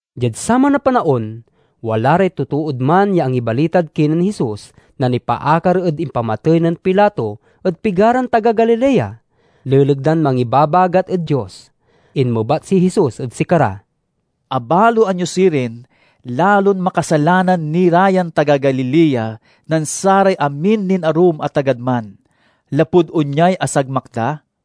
Diad saman a panaon, wala ray totood man ya angibalitad kinen Jesus na nipaakar ed impamatey nen Pilato ed pigaran taga Galilea, leleg dan mangibabagat ed Dios. Inmebat si Jesus ed sikara, "Abaloan yo sirin, lalon makasalanan ni ra yan taga Galilea nen saray amin nin arum a tagad man, lapud onyay asagmak da?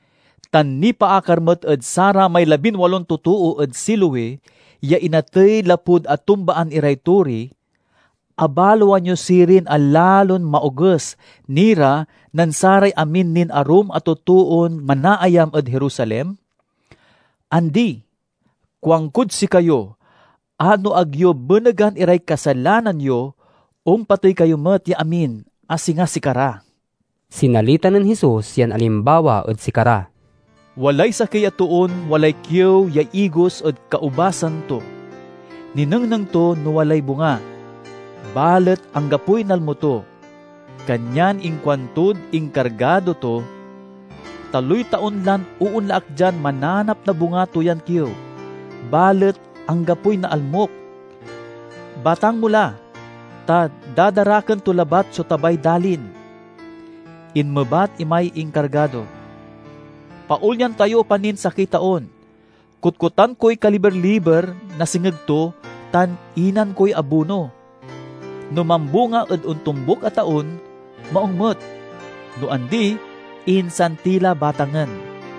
Tan nipaakar met ed saramay labinwalon totoo ed Siloe ya inatey lapud atumbaan iray tori, abaloan yo sirin a lalon maoges ni ra nen saray amin nin arum a totoon manaayam ed Jerusalem? Andi! Kuankod sikayo a no ag yo benegan iray kasalanan yo, ompatey kayo met ya amin, a singa sikara." Sinalita nen Jesus yan alimbawa ed sikara, "Walay sakey a toon walay kiew ya igos ed kaubasan to. Ninengneng to no walay bunga, balet anggapoy nalmo to. Kanyan inkuantod inkargado to, 'Taloy taon lan oonla ak dian mananap na bunga to yan kiew, balet anggapoy naalmok. Batang mo la, ta dadaraken to labat so tabay dalin!' Inmebat imay inkargado, 'Paolyan tayo pa nin sakey taon. Kotkotan koy kaliber-liber na sengeg to, tan inan koy abuno. No mambunga ed ontombuk a taon, maung met; no andi, insan ti la batangen.'"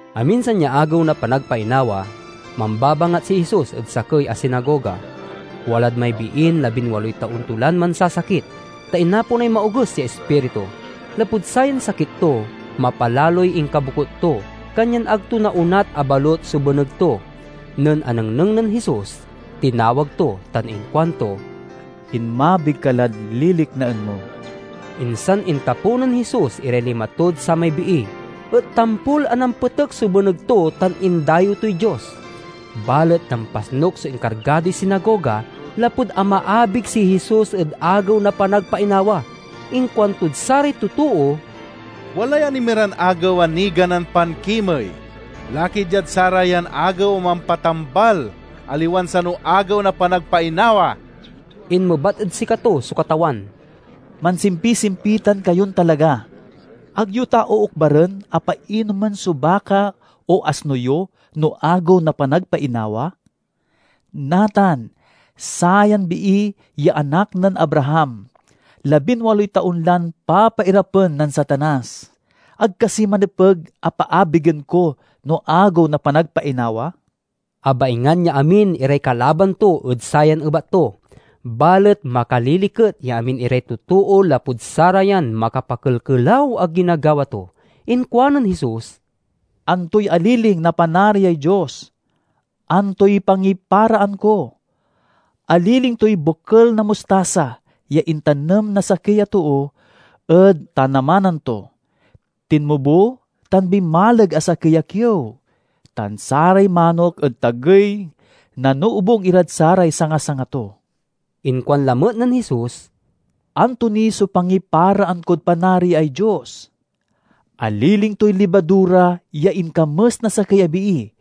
Aminsan ya Agew na Panagpainawa, mambabangat si Jesus ed sakey a sinagoga. Walad may biin labinwaloy taon to lan mansasakit, ta inaponay maoges ya ispiritu. Lapud sayan sakit to mapalaloy inkabokut to, kanyag ag to naonat a balut so beneg to. Nen anengneng nen Jesus, tinawag to tan inkuanto, "Inmabig ka lad liliknaen mo!" Insan intapew nen Jesus iray lima tod samay bii, et tampol a nampetek so beneg to tan indayew toy Dios. Balet nampasnuk so inkargadoy sinagoga, lapud amaabig si Jesus ed Agew na Panagpainawa. Inkuantod saray totoo, "Walay anemiran agew a niganan pankimey. Laki diad sarayan agew a mampatambal, aliwan sano Agew na Panagpainawa!" Inmebat ed sikato so Katawan, "Mansimpisimpitan kayon talaga! Ag yo ta ookbaren a painumen so baka o asno yo no Agew na Panagpainawa? Natan, sayan bii ya anak nen Abraham, labinwaloy taon lan papairapen nen Satanas. Ag kasi manepeg a paabigen ko no Agew na Panagpainawa?" Abaingan ya amin iray kalaban to ed sayan ebat to, balet makaliliket ya amin iray totoo lapud sarayan makapakelkelaw a ginagawa to. Inkuanen Jesus, "Antoy aliling na Panariay Dios? Antoy pangiparaan ko? Aliling toy bokel na mustasa ya intanem na sakey a too ed tanamanan to. Tinmubo tan binmaleg a sakey a kiew, tan saray manok ed tagey nanoobung irad saray sanga-sanga to." Inkuan lamet nen Jesus, "Anto ni so pangiparaan kod Panariay Dios? Aliling toy libadura ya inkames na sakey a bii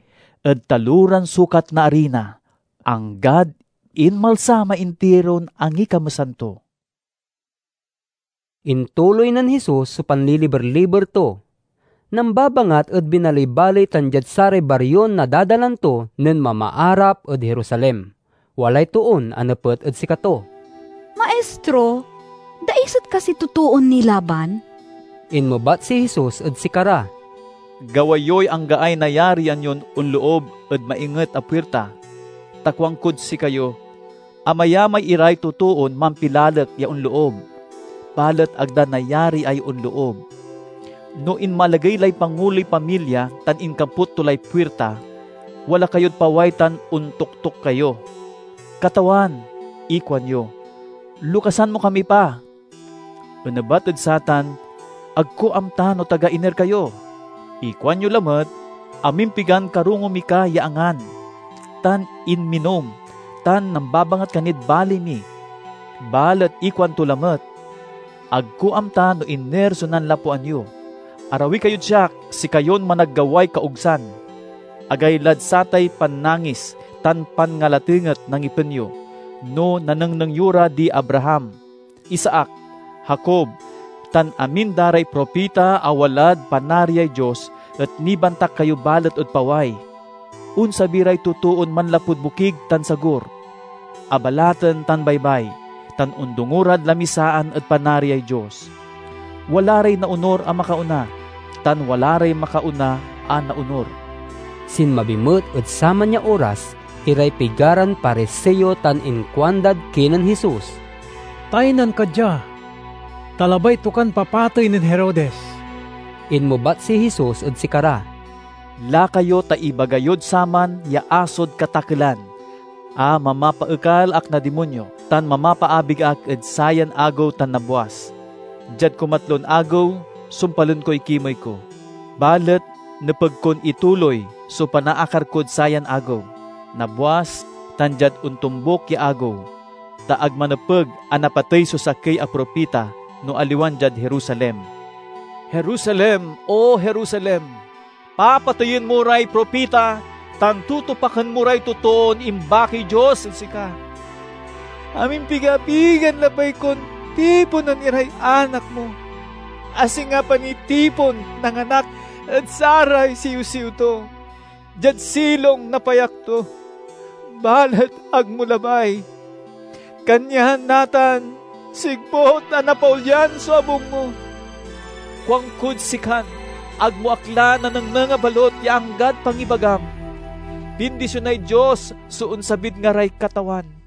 ed taloran sukat na arina, anggad inmalsa may intiron angikamesan to." Intuloy nen Jesus so panliliber-liber to. Nambabangat ed binaley-baley tan diad saray barion nadadalan to nen mamaarap ed Jerusalem. Walay toon anepet ed sikato, "Maistro, daiset kasiy totoon nilaban?" Inmebat si Jesus ed sikara, "Gawa yoy anggaay nayarian yon onloob ed mainget a puirta, ta kuankod sikayo: amayamay iray totoon mampilalek ya onloob, balet ag da nayariay onloob. No inmalagey lay panguloy pamilya tan inkaput to lay puirta, wala kayod paway tan ontoktok kayo. 'Katawan,' inkuanyo, 'lokasan mo kami pa!' Onebat ed satan, 'Ag ko amta no taga iner kayo!' Ikuan yo lamet, 'Amimpigan karongo mi ka ya angan, tan inminom, tan nambabangat ka nid baley mi!' Balet ikuanto lamet, 'Ag ko amta no iner so nanlapoan yo. Arawi kayod siak, sikayon managgaway kaogsan!' Agaylad satay pannangis tan panngalatenget na ngipen yo no nanengneng yo ra di Abraham, Isaac, Jacob tan amin da ray propita a wala rad Panariay Dios et nibantak kayo balet ed paway! Onsabi ray totoon manlapud bokig tan sagur, abalaten tan baybay, tan ondongo rad lamisaan ed Panariay Dios. Wala ray naonur a makaona, tan wala ray makaona a naonur." Sinmabi met ed saman ya oras iray pigaran Pariseo tan inkuandad kinen Jesus, "Taynan ka dia, ta labay to kan papatey nen Herodes." Inmebat si Jesus ed sikara, "Lakayo ta ibaga yod saman ya asod katakelan a mamapaekal ak na dimonyo tan mamapaabig ak ed sayan agew tan nabwas. Diad kumatlon agew, sumpalen koy kimey ko. Balet nepeg kon ituloy so panaakar kod sayan agew, nabwas, tan diad ontombuk ya agew. Ta ag manepeg a napatey so sakey a propita no aliwan diad Jerusalem. "Jerusalem, O Jerusalem! Papateyen mo ray propita tan tutupaken mo ray imbakiy Dios ed sika! Amimpigapigan labay kon tiponen iray anak mo, a singa panitipon na nganak ed saray siwsiw to diad silong na payak to, balet ag mo labay! Kanyan, natan, sigput a napaolyan so abung mo. Kuankod sikan ag mo ak la nanengneng a balut ya anggad pangibagam, 'Bindisionay Dios so onsabid ngaray Katawan!'"